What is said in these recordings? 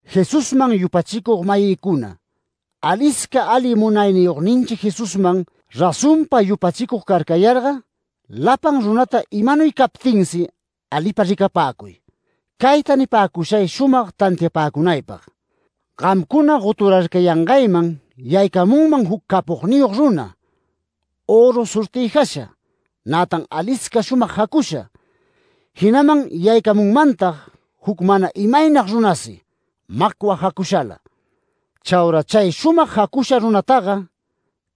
Jesusman yupachicug-mayïcuna, alisca ali Munayniyogninchi Jesusman razonpa yupachicug carcayarga, lapan runata imanuy captinsi alipa ricapäcuy. Cayta nipäcushay shumag tantiapäcunaypag: Gamcuna goturarcayangayman yaycamunman juc capogniyog runa, öru sortïjasha, nätan alisca shumag jacusha. Jinaman yaycamunmantag juc mana imaynag runasi, macwa jacushala. Chaura chay shumag jacusha runataga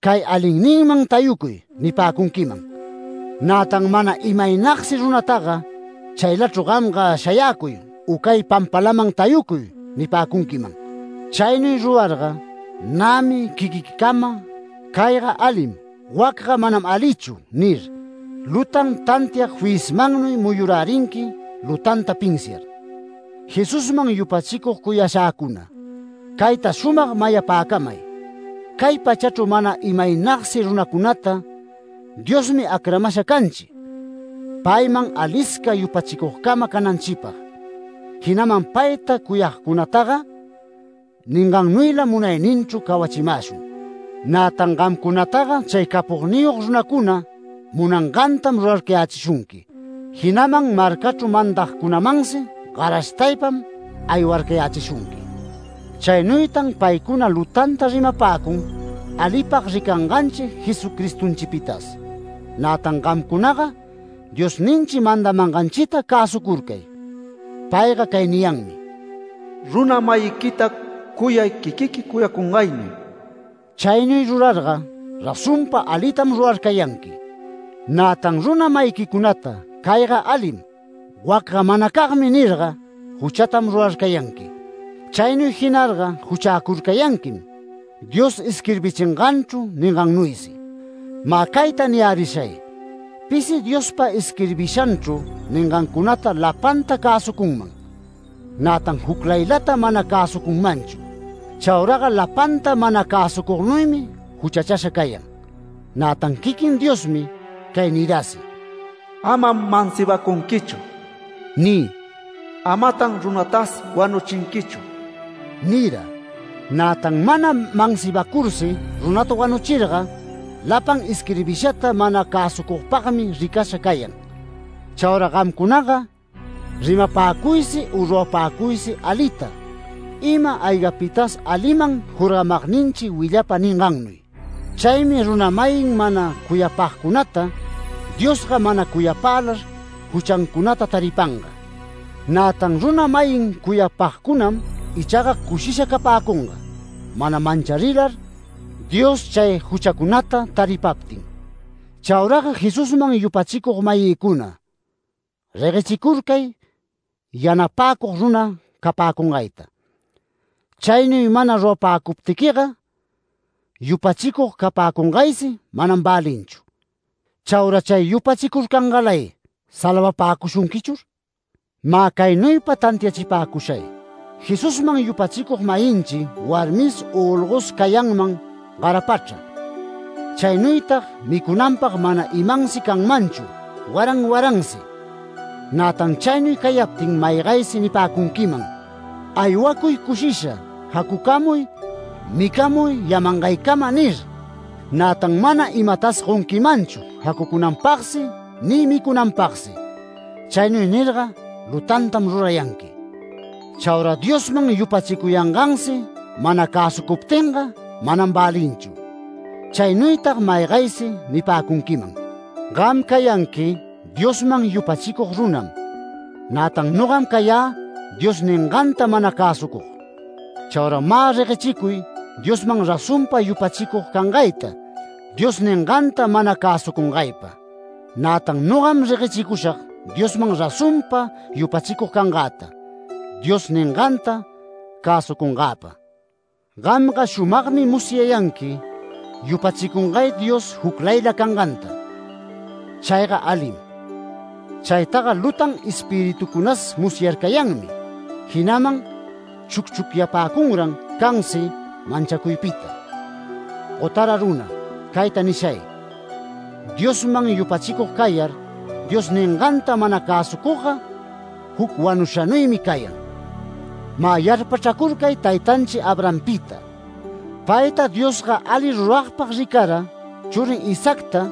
“Cay alinninman tayucuy” nipäcunquiman. Nätan mana imaynagsi runataga “Chaylachru gamga shayäcuy u cay pampalaman tayucuy” nipäcunquiman. Chaynuy rurarga, nämi quiquiquicama “Cayga alim, wacga manam alichu” nir, lutan tantiag fiyismannuy muyurärinqui lutanta pinsiar. Jesusman yupachicug cuyashäcuna, cayta shumag mayapäcamay: Cay pachachru mana imaynagsi runacunata Diosmi acramasha canchi, payman alisca yupachicugcama cananchipag, jinaman payta cuyagcunataga ningannuylam munayninchru cawachimäshun. Nätan gamcunataga chay capogniyog runacuna munangantam rurarcayäshunqui, jinaman marcachru mandagcunamansi garashtaypam aywarcayächishunqui. Chaynuytan paycuna lutanta rimapäcun alipag ricanganchi Jesucristonchipitas. Nätan gamcunaga Diosninchi mandamanganchita cäsucurcay. Payga cay niyanmi: “Runa-mayïta cuyay quiquiqui cuyacungaynuy”. Chaynuy rurarga razonpa alitam rurarcayanqui. Nätan runa-mayiquicunata “Cayga alim, wacga manacagmi” nirga, juchatam rurarcayanqui. Chaynuy jinarga juchäcurcayanquim Dios isquirbichinganchru ningannuysi. Mä cayta niyärishay: Pisi Diospa isquirbishanchru ningancunata lapanta cäsucunman, nätan juclaylata mana cäsucunmanchu. Chauraga lapanta mana cäsucugnuymi juchachasha cayan. Nätan quiquin Diosmi cay nirasi: “Amam mansibacunquichu” ni “Amatan runatas wanuchinquichu” nira. Nätan mana mansibacursi runata wanuchirga lapan isquirbishata mana cäsucugpagmi ricasha cayan. Chaura gamcunaga rimapäcuysi u rurapäcuysi alita, ima-aygapitas aliman jorgamagninchi willapa ningannuy. Chaymi runa-mayin mana cuyapagcunata Diosga mana cuyapälar juchancunata taripanga. Nätan runa-mayin cuyapagcunam ichaga cushisha capäcunga mana mancharilar Dios chay juchacunata taripaptin. Chauraga Jesusman yupachicug-mayïcuna, reguechicurcay yanapäcug runa capäcungaypa. Chaynuy mana rurapäcuptiquiga yupachicug capäcungaysi manam välinchu, ¿Chaura chay yupachicurcangalay salvapäcushunquichur? Mä caynuypa tantiachipäcushay: Jesusman yupachicug-mayinchi warmis u olgos cayanman garapachra, chaynuytag micunanpag mana imansi canmanchu waran waransi. Nätan chaynuy cayaptin maygaysi nipäcunquiman: “Aywacuy cushisha, jacucamuy, micamuy yamangaycama” nir, nätan mana imatas gonquimanchu jacucunanpagsi ni micunanpagsi. Chaynuy nirga lutantam rurayanqui. Chaura Diosman yupachicuyangansi mana cäsucuptinga manam välinchu. Chaynuytag maygaysi nipäcunquiman: “Gam cayanqui Diosman yupachicug runam, nätan nogam cayä Dios ninganta mana cäsucug”. Chaura mä reguechicuy Diosman razonpa yupachicug cangayta Dios ninganta mana cäsucungaypa, nätan nogam reguechicushag Diosman razonpa yupachicug cangäta Dios ninganta cäsucungäpa. Gamga shumagmi musyayanqui yupachicungay Dios juclayla canganta. Chayga alim. Chaytaga lutan espiritucunas musyarcayanmi, jinaman chucchucyapäcunran cansi manchacuypita. ¡Gotara runa! cayta nishay: Diosman yupachicug cayar Dios ninganta mana cäsucugga, juc wanushanuymi cayan. Mä yarpachracurcay taytanchi Abrahampita. Payta Diosga ali ruragpag ricara, churin Isaacta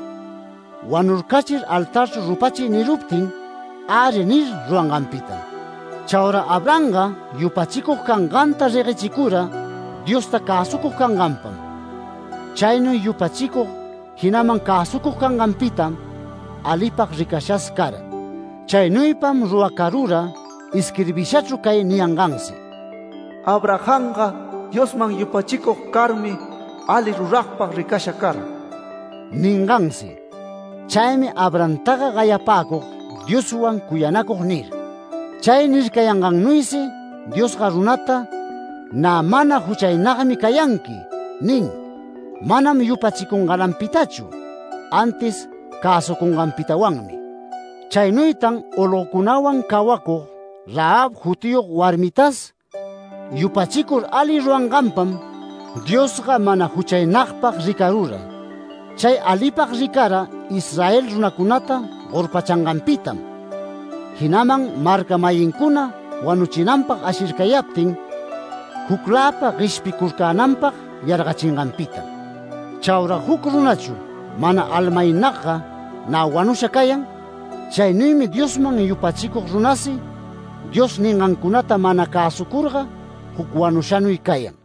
“Wanurcachir altarchru rupachiy” niruptin “Äri” nir, ruranganpitam. Chaura Abrahamga yupachicug canganta reguechicura Diosta cäsucug canganpam. Chaynuy yupachicug, jinaman cäsucug canganpitam alipag ricashas cara. Chaynuypam ruracarura isquirbishachru cay niyangansi: “Abrahamga Diosman yupachicug carmi, ali ruragpag ricasha cara” ningansi. Chaymi Abrahamtaga gayapäcug Dioswan cuyanacug nir. Chay nircayangagnuysi, Diosga runata “Nä mana juchaynagmi cayanqui” nin, manam yupachicungalanpitachu antis cäsucunganpitawanmi. Chaynuytan olgocunawan cawacug Rahab jutiyog warmitas yupachicur ali ruranganpam Diosga mana juchaynagpag ricarura. Chay alipag ricara Israel runacunata gorpachanganpitam, jinaman marca-mayincuna wanuchinanpag ashircayaptin, jucläpa gueshpicurcänanpag yargachinganpitam. Chaura juc runachu mana almaynagga nä wanusha cayan, chaynuymi Diosman yupachicug runasi Dios ningancunata mana cäsucurga juc wanushanuy cayan.